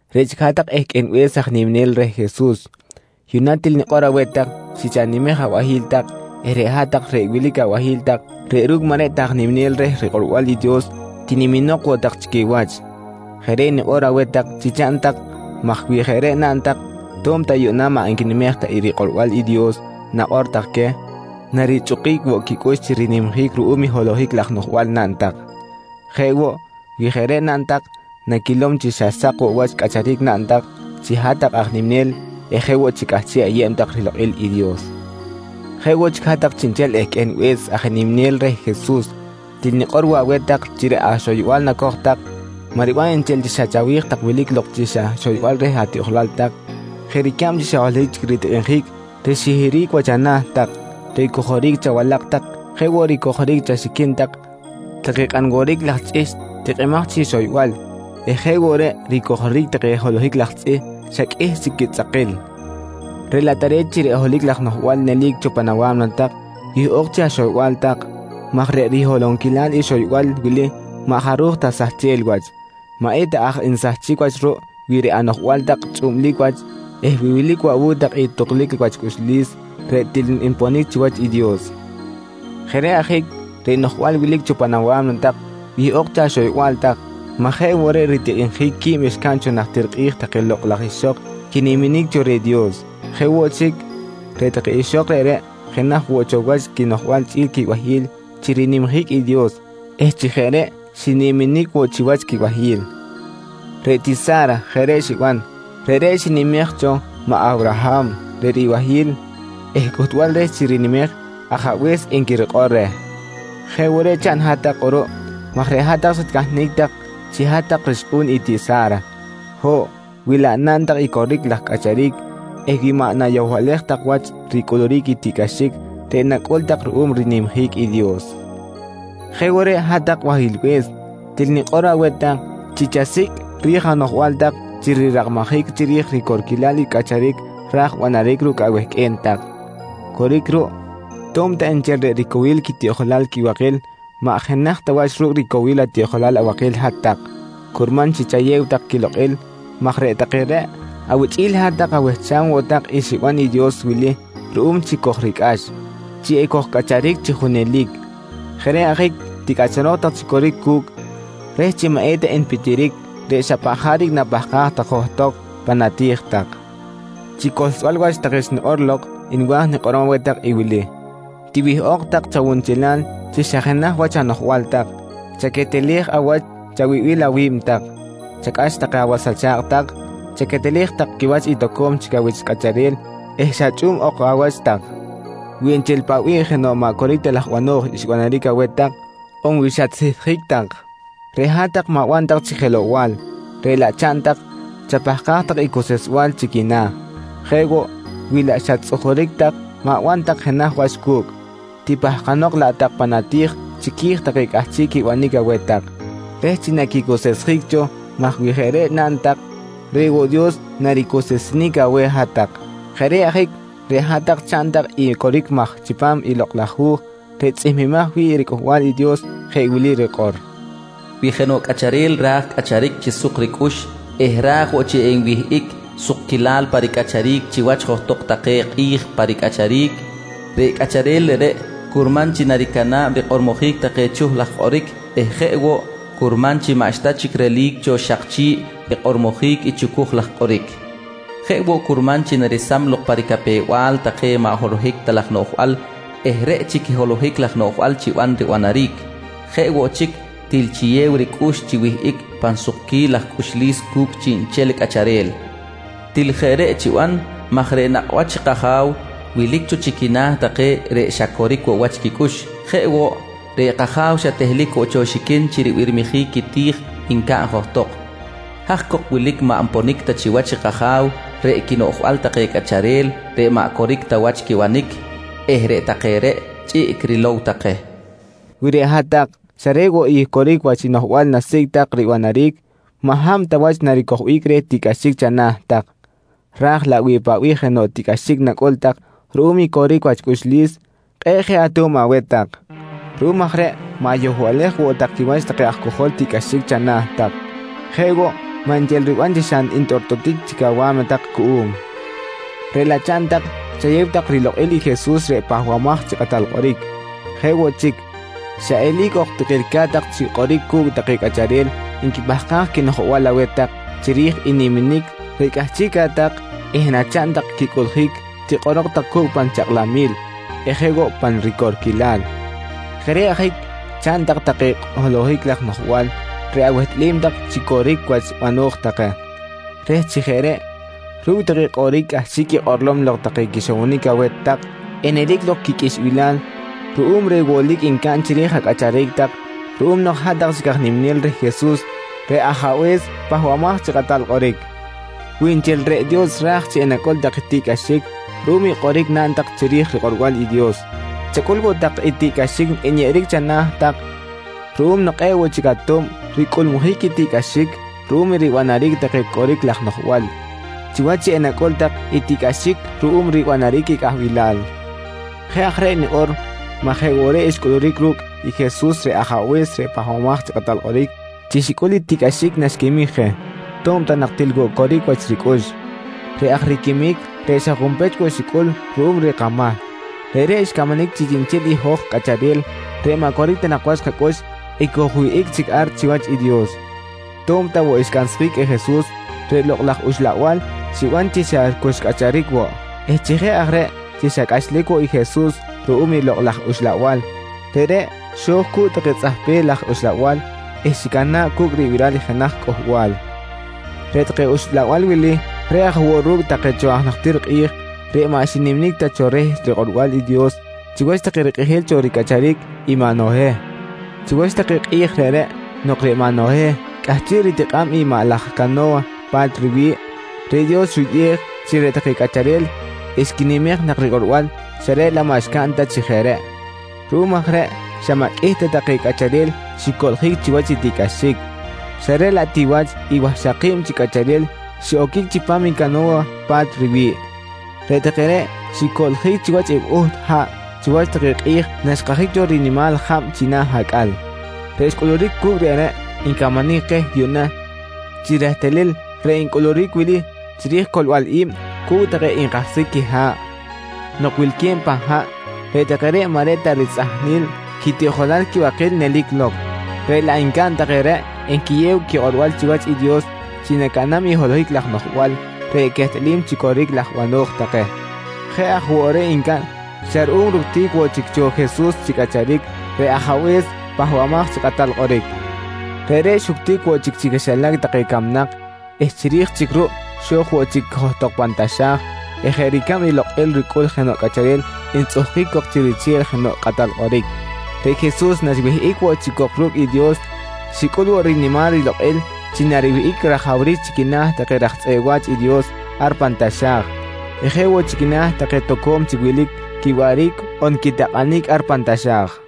Reꞌ chic hat-tak ehqꞌuenbe̱s aj niminel reh Jesus, yuꞌna til nikꞌor aweh tak chi chanimej abahi̱l tak eh reꞌ hat-tak reꞌ wilic abahi̱l tak reꞌ ru̱cꞌ maꞌ reꞌ ta aj niminel reh rikꞌorbal i Dios tiniminok woꞌ tak chi quiwach. Jeꞌ reꞌ nikꞌor aweh tak chi chaꞌn tak maj wi jeꞌ reꞌ naꞌn tak to̱b ta yuꞌna maꞌ nquinimej ta i rikꞌorbal i Dios nakꞌor tak queh, narichꞌukic woꞌ quicꞌux chi rinimjic ruꞌum i holohic laj noꞌjbal naꞌn tak. Jeꞌ woꞌ wi jeꞌ reꞌ naꞌn tak, naquilom chi xa sak woꞌ wach cꞌacharic naꞌn tak chi hat-tak aj niminel eh jeꞌ woꞌ chi cꞌahchiꞌ ayeb tak rilokꞌil i Dios. Jeꞌ woꞌ chic hat-tak chiꞌnchel ehqꞌuenbe̱s aj niminel reh Jesus til nikꞌor woꞌ aweh tak chi reꞌ axoyba̱l nacoj tak, maꞌ riban nchel chi xa chawi̱j tak wilic lok chi xa xoybal reh atiꞌjolal tak jeꞌ ricab chi xa holohic chic ritikꞌinjic rixihiric wach ana̱ tak, reꞌ ricojoric chawalak tak jeꞌ woꞌ ricojoric chaxiquin tak take kꞌan woric laj chꞌihchꞌ tikꞌimaj chi xoybal eh jeꞌ woꞌ reꞌ ricojoric take holohic laj tzꞌih xa qꞌuih chic quitzꞌakil, reꞌ laꞌ tare̱t chi reꞌ holohic laj noꞌjbal nelic cho pan awa̱mna tak wihꞌok chi axoyba̱l tak maj reꞌ riholonquilal i xoybal wili maꞌ jaruj ta sahchel wach. Maꞌeta aj nsahchic wach ruꞌ wi reꞌ anoꞌjbal tak chꞌublic wach eh wi wilic woꞌ awu̱cꞌ tak i tuklic wach cꞌuxlis reꞌ til nponic chiwach i Dios. Jeꞌ reꞌ ajic reꞌ noꞌjbal wilic cho pan awa̱mna tak wihꞌok chi axoyba̱l tak maj jeꞌ woꞌ reꞌ ritikꞌinjic qui̱b xcaꞌn cho najtir kꞌi̱j take lokꞌ laj ixok quiniminic cho reh Dios. Jeꞌ woꞌ chic, reꞌ take ixok reꞌreꞌ jenaj woꞌ cho wach quinoꞌjbal chꞌi̱l quibahi̱l chi rinimjic i Dios eh chi jeꞌ reꞌ xiniminic woꞌ chiwach quibahi̱l. Reꞌ tiꞌ Sa̱ra jeꞌ reꞌ xiban, reꞌreꞌ xinimej cho maꞌ Awraham reꞌ ribahi̱l eh cꞌuhtbal reh chi rinimej “ajabe̱s” nqui rikꞌor reh. Jeꞌ woꞌ reꞌ chaꞌn hat-tak kꞌuruꞌ maj reꞌ hat-tak xatcahnic tak chi hat-tak rixkꞌu̱n i tiꞌ Sa̱ra. Ho̱ꞌ, wi laꞌ naꞌn tak i coric laj cꞌacharic eh wi maꞌ nayohbalej tak wach ricꞌuluric i tiꞌcꞌaxic reꞌ nacꞌul tak ruꞌum rinimjic i Dios. Jeꞌ woꞌ reꞌ hat-tak bahilbe̱s, til nikꞌor aweh tak chi chasicꞌ ri̱j anoꞌjbal tak chi rirakmajic chiri̱j ricorquilal i cꞌacharic ra̱j banaric ru̱cꞌ awehqꞌue̱n tak. Coric ruꞌ, to̱b ta nchel reꞌ ricowil quitiꞌjolal quibakil maꞌ jenaj ta wach ru̱cꞌ ricowil atiꞌjolal abakil hat-tak, curman chi chayew tak quilokꞌil maj reꞌ take reꞌ awichꞌi̱l hat-tak awehcham woꞌ tak i xiban i Dios wili ruꞌum chi kojricꞌax: Chi ekojcꞌacharic chi junelic. Jeꞌ reꞌ ajic ticꞌacharok tak chi coric cu̱cꞌ reh chi maꞌ eta npitiric reꞌ xa paꞌ jaric napahkaj tak johtok pan ati̱j tak. Chi cohlsbal wach take xnikꞌor lok, nwa̱j nikꞌorom aweh tak i wili: Tiwihꞌok tak chawunchelal chi xa jenaj wach anoꞌjbal tak, chaquetelej awach chawibil awi̱b tak, chacꞌax take awas acha̱kꞌ tak, chaquetelej tak quiwach i toco̱m chic awich cꞌacharel eh xa chꞌu̱b ok awach tak. Wi nchel paꞌ bih jenoꞌ maꞌ coric ta laj bano̱j xbanaric aweh tak on wi xatsihtjic tak, reꞌ hat-tak ma̱ban tak chic jelow-bal, reꞌ laꞌ chaꞌn tak chapahkaj tak i cuseꞌsbal chi quina̱. Jeꞌ woꞌ, wi laꞌ xat-tzꞌujuric tak ma̱ban tak jenaj wach cu̱cꞌ, tipahkanok laꞌ tak pan ati̱j chiqui̱j take cꞌahchiꞌ quibanic aweh tak, reh chi naquicuseꞌsjic cho maj wi jeꞌ reꞌ naꞌn tak reꞌ woꞌ Dios naricuseꞌsenic aweh hat-tak. Jeꞌ reꞌ ajic reꞌ hat-tak chaꞌn tak i coric maj chipam i Lokꞌ laj Hu̱j reꞌ tzꞌihmbimaj wi̱ꞌ i riCꞌuhbal i Dios jeꞌ wili rikꞌor: “Wi jenoꞌ cꞌacharel ra̱j cꞌacharic chi suk ricꞌux eh ra̱j woꞌ chi enwihꞌic sukquilal pa ricꞌacharic chiwach johtok take kꞌi̱j pa ricꞌacharic, reꞌ cꞌacharel reꞌreꞌ curman chi naricana̱b rikꞌormojic take chuh laj kꞌoric eh jeꞌ woꞌ curman chi maꞌxta chic relic cho xak chi̱ꞌ rikꞌormojic i chucuj laj kꞌoric. Jeꞌ woꞌ curman chi naresam lok pa ricapew-bal take maꞌ holohic ta laj noꞌjbal eh reꞌ chic i holohic laj noꞌjbal chiban ribanaric. Jeꞌ woꞌ chic til chiyew ricꞌux chi wihꞌic pan sukquil laj cꞌuxlis cu̱cꞌ chiꞌnchel cꞌacharel. Til jeꞌ reꞌ chiban maj reꞌ nakꞌ wach i kAja̱w wilic cho chi quina̱ take reꞌ xa coric woꞌ wach quicꞌux. Jeꞌ woꞌ, reꞌ kAja̱w xa tehlic woꞌ cho xiquin chi ribirmijic quiti̱j ncaꞌn johtok. Haj cok wilic maꞌ nponic ta chiwach i kAja̱w reꞌ i quinoꞌjbal take cꞌacharel reꞌ maꞌ coric ta wach quibanic eh reꞌ take reꞌ, chꞌiꞌc rilow take, nqui rikꞌor. Wi reꞌ hat-tak xa reꞌ woꞌ i coric wach noꞌjbal nasicꞌ tak ribanaric, maꞌ hab ta wach naricojbic reh tiꞌcꞌaxic chana̱ tak, raj laꞌ wi paꞌ bih jenoꞌ tiꞌcꞌaxic nacꞌul tak ruꞌum i coric wach cꞌuxlis, kꞌe̱ꞌ je ato̱b aweh tak. Ruꞌum aj reꞌ ma̱yohbalej woꞌ tak quiwach take aj cojol tiꞌcꞌaxic chana̱ tak. Jeꞌ woꞌ maꞌ nchel riban chi xa ntꞌortꞌotic chic awa̱mna tak cuꞌum, reꞌ laꞌ chaꞌn tak chayew tak rilokꞌil i Jesus reꞌ Pahbamaj chi Kꞌatal Kꞌoric. Jeꞌ woꞌ chic, xa eli̱c ok tikilca̱t tak chi kꞌoric cu̱cꞌ take cꞌacharel nquipahkaj quinoꞌjbal aweh tak chiri̱j i niminic reꞌ cꞌahchiꞌca̱t tak eh nachaꞌn tak quicꞌuꞌljic tikꞌorok tak cu̱cꞌ pan chakꞌlamil eh jeꞌ woꞌ pa ricorquilal. Jeꞌ reꞌ ajic chaꞌn tak take holohic laj noꞌjbal reꞌ awehtꞌalim tak chi coric wach bano̱j take, reh chi jeꞌ reꞌ ru̱cꞌ take kꞌoric cꞌahchiꞌ quikꞌorlom lok take quixowonic aweh tak enelic lok quiqꞌuixbilal ruꞌum reh wolic ncaꞌn chiri̱j acꞌacharic tak ruꞌum nok hat-tak chic aj niminel reh Jesus reꞌ Ajabe̱s Pahbamaj chi Kꞌatal Kꞌoric. Wi nchel reꞌ Dios ra̱j chi enacꞌul tak i tiꞌcꞌaxic ruꞌum i kꞌoric naꞌn tak chiri̱j rikꞌorbal i Dios, chacꞌul woꞌ tak i tiꞌcꞌaxic nyeꞌeric chana̱ tak ruꞌum nok kꞌe̱ꞌ woꞌ chic ato̱b ricꞌulmujic i tiꞌcꞌaxic ruꞌum ribanaric take coric laj noꞌjbal, chiwach chi enacꞌul tak i tiꞌcꞌaxic ruꞌum ribanaric i cꞌahbilal. Jeꞌ aj reꞌ nikꞌor maj jeꞌ woꞌ reꞌ xcꞌuluric ru̱cꞌ i Jesus reꞌ Ajabe̱s reꞌ Pahbamaj chi Kꞌatal Kꞌoric chi xicꞌul i tiꞌcꞌaxic naxquimic je to̱b ta nak til woꞌ coric wach ricꞌux. Reꞌ aj riquimic reꞌ xa junpech woꞌ xicꞌul ruꞌum reh kamahc, reꞌreꞌ xcamanic chi chiꞌnchel i hoj cꞌacharel reꞌ maꞌ coric ta nak wach kacꞌux ekojwihꞌic chic ar chiwach i Dios. To̱b ta woꞌ xcansjic i Jesus, reꞌ Lokꞌ laj Uxlabal xiban chi xa cu xcꞌacharic woꞌ eh chi jeꞌ aj reꞌ chi xa cꞌachlic woꞌ i Jesus ruꞌum i Lok laj Uxlabal, reꞌreꞌ xo̱j cu̱cꞌ take tzꞌahpel laj uxlabal eh xicana̱ꞌ cu̱cꞌ ribiral jenaj cꞌuhbal. Reꞌ take uxlabal wili reꞌ aj woꞌ ru̱cꞌ take cho aj najtir kꞌi̱j reꞌ maꞌ xiniminic ta cho reh rikꞌorbal i Dios chiwach take rikꞌijil cho ricꞌacharic i maꞌ Noheh. Chiwach take kꞌi̱j reꞌreꞌ nok reꞌ maꞌ Noheh cꞌahchiꞌ ritikꞌa̱b i maꞌ laj cano̱wa pa̱t riwi̱ꞌ, reꞌ Dios xuyꞌej chi reꞌ take cꞌacharel xquinimej nak rikꞌorbal xa reꞌ laꞌ maꞌ xcaꞌn ta chi jeꞌ reꞌ. Ruꞌum aj reꞌ xa maꞌ qꞌuih ta take cꞌacharel xicoꞌljic chiwach i tiꞌcꞌaxic, xa reꞌ laꞌ ti wach i wahxaki̱b chi cꞌacharel xiꞌoquic chipam i cano̱wa pa̱t riwi̱ꞌ. Reꞌ take reꞌ xicoꞌljic chiwach i buht haꞌ chiwach take kꞌi̱j naxkajic cho rinimal jab china̱ acꞌal. Reꞌ xcꞌuluric cu̱cꞌ reꞌreꞌ ncamanic keh yuꞌna chi rehtalil reꞌ ncꞌuluric wili chiri̱j i coꞌlbal i̱b cu̱cꞌ take nkahsjic quiha̱ꞌ: Nok wilque̱b pan haꞌ, reꞌ take reꞌ maꞌ reꞌ ta ritzꞌajnil quitiꞌjolal quibakil nelic lok reꞌ laꞌ ncaꞌn take reꞌ nquiyew quikꞌorbal chiwach i Dios chi nacaꞌnam i holohic laj noꞌjbal reꞌ quehtꞌalim chi coric laj bano̱j take. Jeꞌ aj woꞌ reꞌ ncaꞌn xa ruꞌum ructic woꞌ chic cho Jesus chi cꞌacharic, reꞌ Ajabe̱s Pahbamaj chi Kꞌatal Kꞌoric. Reꞌreꞌ xuctic woꞌ chic chi quixilac take camnak eh chiri̱j chic ruꞌ xo̱j woꞌ chic johtok pan taxa̱j eh jeꞌ ricab i lokꞌil ricꞌul jenoꞌ cꞌacharel ntzꞌuhkic cok chi riche̱l jenoꞌ kꞌatal kꞌoric, reꞌ Jesus naxwihꞌic woꞌ chic cok ru̱cꞌ i Dios, xicꞌul woꞌ rinimal rilokꞌil chi nariwihꞌic rajawric chi quina̱ take raj tzꞌeꞌ wa̱ch i Dios ar pan taxa̱j eh jeꞌ woꞌ chi quina̱ take toco̱m chic wilic quiwaꞌric on quitakꞌanic ar pan taxa̱j.